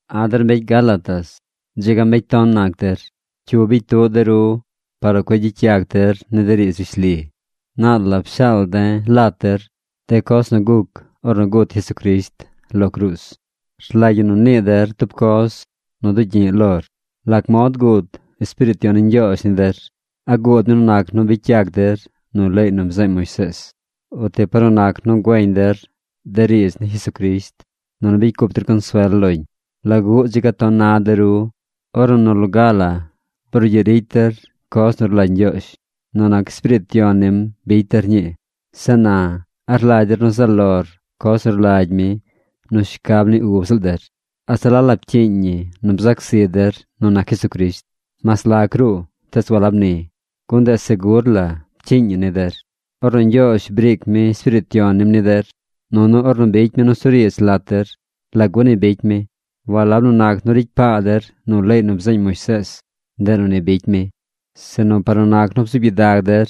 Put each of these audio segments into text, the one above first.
¡A̱ der mbecy Gálatas, dzi ga mbecy ton nac der! ¿Cyu bicy tuꞌ de ru par nu cueꞌ gyicy yac der ni de riidz rishli? Naal la pshaal de̱ lat der de coz nu guc ornu gut Jesucrisht lo cruuz. Rlagy ñi nu nii der tub coz nu dugyi̱ꞌ lor: ¿Lac mod guud Espiriit Yon ni Ñgyoozh ni der? ¿A guud mi nu nac nu bicy yac der nu leey nu bzeeñ Moisees, o ti par nu nac nu güeñ der de riidz ni Jesucrisht, nunu bicy cup der consuel loñ? ¿Laguꞌ dzi ga ton na de ru? Ornu nu loga brugyiꞌ ricy der coz nu rlagy Ñgyoozh. Nu nac Espiriit Yon nim bicy der ñii. Zeꞌ na ¿a rlagy der nu zaꞌ lor coz nu rlagy mi nu shcab ni ub ziꞌl der? ¿A se la la pcyiiñ ñi nu bzac zi der nu nac Jesucrisht? ¡Mas lac ruꞌ, tees walab ni, gun ndeꞌ segur la pcyiiñ ñi ni der! Ornu Ñgyoozh briic mi Espiriit Yon nim ni der, nunu ornu bicy mi nusuriidz lat der, ¿lagu ni bicy mi? Walab nu nac nu ricy paa der nu leey nu bzeeñ Moisees, ndeꞌ nu ni bicy mi, sinu par nu nac nu bzuub gyidag der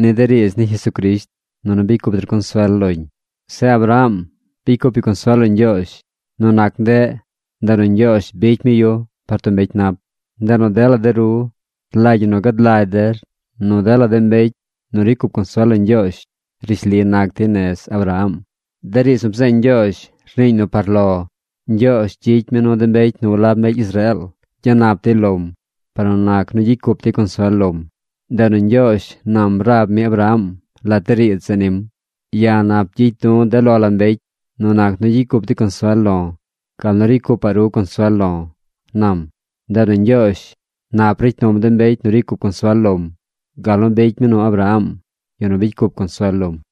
ni de riidz ni Jesucrisht, nunu bicy cup der consuel loñ. Zeꞌ Abraham bicy cup yu consuel lo Ñgyoozh. Nu nac ndeꞌ, ndeꞌ nu Ñgyoozh bicy mi yu par tub mbecy nap. Ndeꞌ nu dela de ru rlagy ñi nu gad lagy der nu dela de mbecy nu ricy cup consuel lo Ñgyoozh, rishli nac dey nez Abraham. De riidz nu bzeeñ Ñgyoozh rniiñ nu par lo, Ñgyoozh gyicy mi nu de mbecy nu walab mbecy Israeel gyanap dey lom par nu nac nu gyicy cup dey consuel lom. Ndeꞌ nu Ñgyoozh nam rab mi Abraham lat de riidz zeꞌ nim: “Ya̱ nap gyicy du̱ de lo la mbecy nu nac nu gyicy cup dey consuel lo̱ gal nu ricy cupaꞌ ru consuel lo̱”, nam. Ndeꞌ nu Ñgyoozh nap ricy num de mbecy nu ricy cup consuel lom, gal nu bicy mi nu Abraham, yu nu bicy cup consuel lom.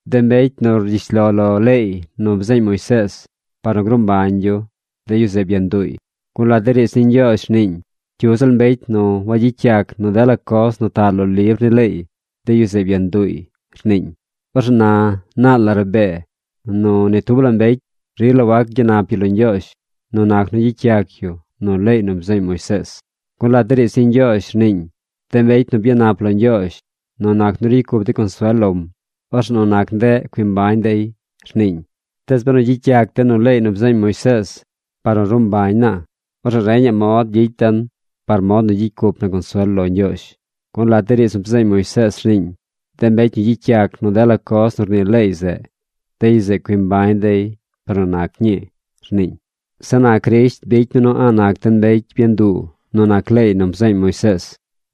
De mbecy nu rgyish lo lo leey nu bzeeñ Moisees par nu gruu mbañ yu, de yu zeꞌ byanduuy, gun lat de riidz ni Ñgyoozh rniiñ: “Cyu ziꞌl mbecy nu wagyicy yac nu dela coz nu taꞌ lo libr ni leey, de yu zeꞌ byanduuy”, rniiñ. Orzeꞌ na naal la rabee nu, ni tub la mbecy rila wac gyanap yu lo Ñgyoozh nu nac nu gyicy yac yu nu leey nu bzeeñ Moisees. Gun lat de riidz ni Ñgyoozh rniiñ: “De mbecy nu byanap lo Ñgyoozh nu nac nu ricy cup dey consuel lom, orzeꞌ nu nac ndeꞌ cui mbañ dey”, rniiñ. Tees benu gyicy yac den nu leey nu bzeeñ Moisees par nu ruu mbañ naa, orzeꞌ reñaꞌ mod gyicy den par mod nu gyicy cup na consuel lo Ñgyoozh. Gun lat de riidz nu bzeeñ Moisees rniiñ: “De mbecy nu gyicy yac nu dela coz nu rnii leey zeꞌ, de yu zeꞌ cui mbañ dey par nu nac ñii”, rniiñ. Zeꞌ na Crisht bicy mi nu a̱ꞌ nac den mbecy byanduu nu nac leey nu bzeeñ Moisees.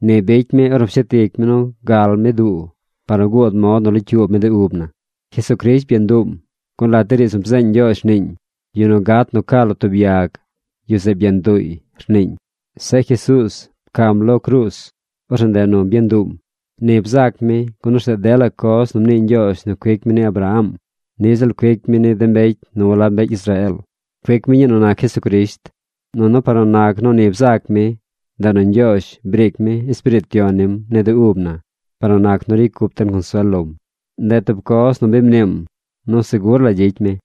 Ni bicy mi ornu pshet ic mi nu gal mi duu par nu guud mod nu locyuub mi de ub na. Jesucrisht byanduum, gun lat de riidz nu bzeeñ Ñgyoozh rniiñ: “Yu nu gat nu ca lo tub yag, yu zeꞌ byanduuy”, rniiñ. Zeꞌ Jesuuz pcam lo cruuz. Orzeꞌ ndeꞌ nu byanduum. Ni bzac mi gun orzeꞌ dela coz nu mnii Ñgyoozh nu cuic mi ni Abraham niꞌ ziꞌl cuic mi ni de mbecy nu walab mbecy Israeel. Cuic mi ñii nu nac Jesucrisht. Nunu par nu nac nu ni bzac mi, ndeꞌ nu Ñgyoozh briic mi Espiriit Yon nim ni de ub na par nu nac nu ricy cup den consuel lom. Ndeꞌ tub coz nu bi mniim nu segur la gyicy mi.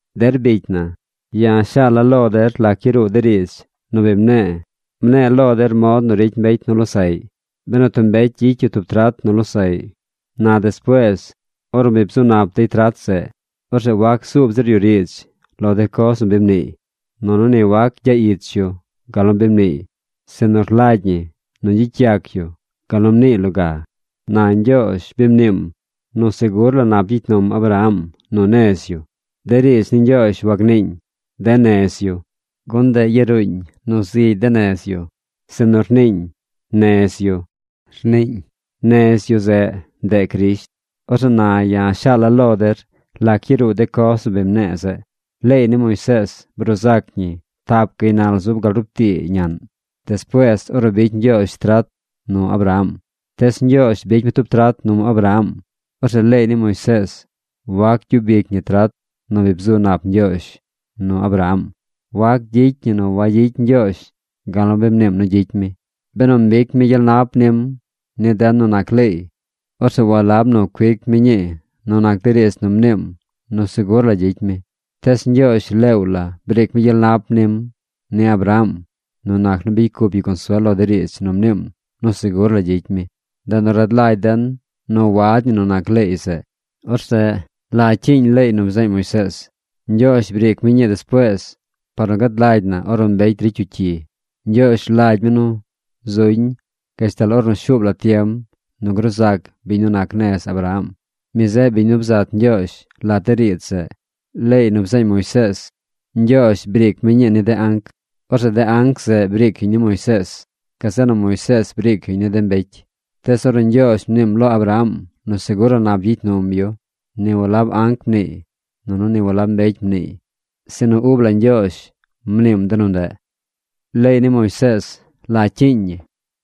Der bicy na, ya̱ shaal la̱ lo der lac yaruu de riidz nu bi mne̱e̱. Mne̱e̱ lo der mod nu ricy mbecy nu losaꞌy. Benu tub mbecy gyicy yu tub trat nu losaꞌy, na despuees ornu bi bzu nap dey trat zeꞌ, orzeꞌ wac zuub zir yu riidz lo de coz nu bi mniiy. Nunu ni wac gyaꞌ ich yu gal nu bi mniiy. Sinu rlagy ñi nu gyicy yac yu gal nu mniiy loga. Na Ñgyoozh bi mniim nu segur la nap gyicy num Abraham nu nez yu. De riidz ni Ñgyoozh wagniiñ: “De nez yu”, gun ndeꞌ yaruuñ nu zigy de nez yu, sinu rniiñ: “Nez yu”, rniiñ. Nez yu zeꞌ, ndeꞌ Crisht. Orzeꞌ na ya̱ shaal la̱ lo der lac yaruu de coz nu bi mne̱e̱ zeꞌ. Leey ni Moisees bruu zac ñi tap gaynal zub gal rup tii ñaꞌn despuees ornu bicy Ñgyoozh trat nu Abraham. Tees Ñgyoozh bicy mi tub trat num Abraham. Orzeꞌ leey ni Moisees wac gyub ic ñi trat nu bi bzu nap Ñgyoozh nu Abraham. Wac gyicy ñi nu wayicy Ñgyoozh gal nu mniim nu gyicy mi. Benu mbic mi gyel nap nim ni den nu nac leey, orzeꞌ walab nu cuic mi ñii nu nac de riidz nu mniim nu segur la gyicy mi. Tees Ñgyoozh leew la briic mi gyel nap nim ni Abraham nu nac nu bicy cup yu consuel lo de riidz nu mniim nu segur la gyicy mi. Ndeꞌ nu rad lagy den nu wad ñi nu nac leey zeꞌ. Orzeꞌ ¿la cyiiñ leey nu bzeeñ Moisees? Ñgyoozh briic mi ñii despuees par nu gad lagy na ornu mbecy ricy yu cyi. Ñgyoozh rlagy mi nu zuñ gashtal ornu shuub la tiem nu gruu zac biñ nu nac nez Abraham. Mi zeꞌ biñ nu bzat Ñgyoozh lat de riidz zeꞌ. Leey nu bzeeñ Moisees, Ñgyoozh briic mi ñii ni de anc. Orzeꞌ de anc zeꞌ briic yuñ ni Moisees. Gazeꞌ nu Moisees briic yuñ ni de mbecy. Tees ornu Ñgyoozh mniim lo Abraham nu segur la nap gyicy num yu, ni walab anc mniiy nunu ni walab mbecy mniiy, sinu ub la Ñgyoozh mniim de nu ndeꞌ. Leey ni Moisees, ¿la cyiiñ ñi?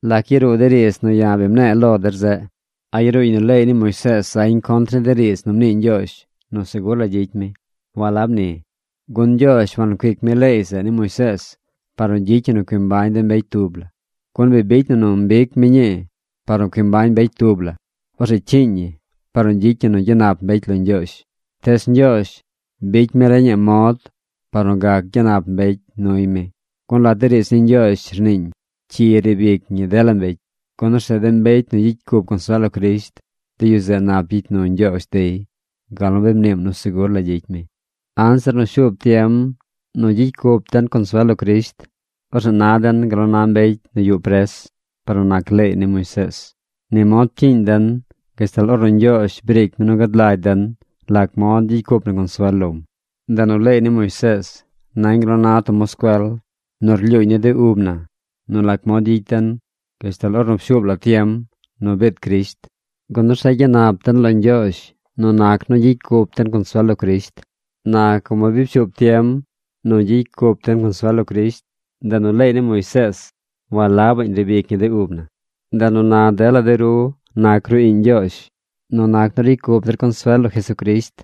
¿Lac yaruu de riidz nu ya̱ bi mne̱e̱ lo der zeꞌ? ¿A yaruuñ nu leey ni Moisees zañ contr ni de riidz nu mnii Ñgyoozh nu segur la gyicy mi? ¡Walab ni! Gun Ñgyoozh wancuic mi leey zeꞌ ni Moisees par nu gyicy ñi nu cui mbañ de mbecy tub la. Gun bi bicy na nu mbic mi ñii par nu cui mbañ mbecy tub la, orzeꞌ cyiiñ ñi par nu gyicy ñi nu gyanap mbecy lo Ñgyoozh. Tees Ñgyoozh bicy mi reñaꞌ mod par nu gac gyanap mbecy nuy mi. Gun lat de riidz ni Ñgyoozh rniiñ: “Cyi riib ic ñi dela mbecy.” Gun orzeꞌ de mbecy nu gyicy cup consuel lo Crisht, de yu zeꞌ nap gyicy nu Ñgyoozh dey gal nu bi mniim nu segur la gyicy mi. Anzir nu shuub tiem nu gyicy cup den consuel lo Crisht, orzeꞌ na den gal nu na de mbecy nu yuꞌ pres par nu nac leey ni Moisees. Ni mod pcyiiñ den gashtal Ñgyoozh briic mi nu gad lagy den lac mod gyicy cup na consuel lom. Ndeꞌ nu leey ni Moisees nañ gal nu na tub moscuel nu rlyuuñ ni de ub na nu lac mod gyicy den gashtal ornu pshuub la tiem nu biid Crisht, gun orzeꞌ gyanap den lo Ñgyoozh nu nac nu gyicy cup den consuel lo Crisht. Na como bi pshuub tiem nu gyicy cup den consuel lo Crisht, ndeꞌ nu leey ni Moisees walabaꞌñ nu riib ic ñi de ub na. Ndeꞌ nu na dela de ru nac ru iꞌñ Ñgyoozh nu nac nu ricy cup der consuel lo Jesucrisht.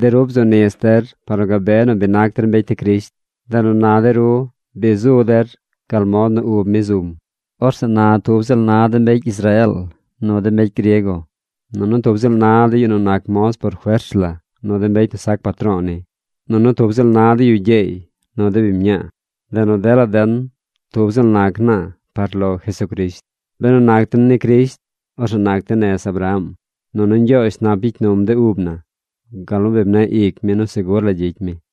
De ru bzu nis der par nu gabe nu bi nac der mbecy ni Crisht. Ndeꞌ nu na de ru bi zu der gal mod nu ub mi zum. Orzeꞌ na tub ziꞌl na de mbecy Israeel nu de mbecy griego. Nunu tub ziꞌl na de yu nu nac moz por fers la nu de mbecy nu sac patro̱o̱ ni. Nunu tub ziꞌl na de yu gyeey nu de biñ mñaa. Ndeꞌ nu dela den, tub ziꞌl nac naa par lo Jesucrisht. Benu nac den ni Crisht, orzeꞌ nac den nez Abraham. Nunu Ñgyoozh nap gyicy num de ub na gal nu bi mneꞌ ic mi nu segur la gyicy mi.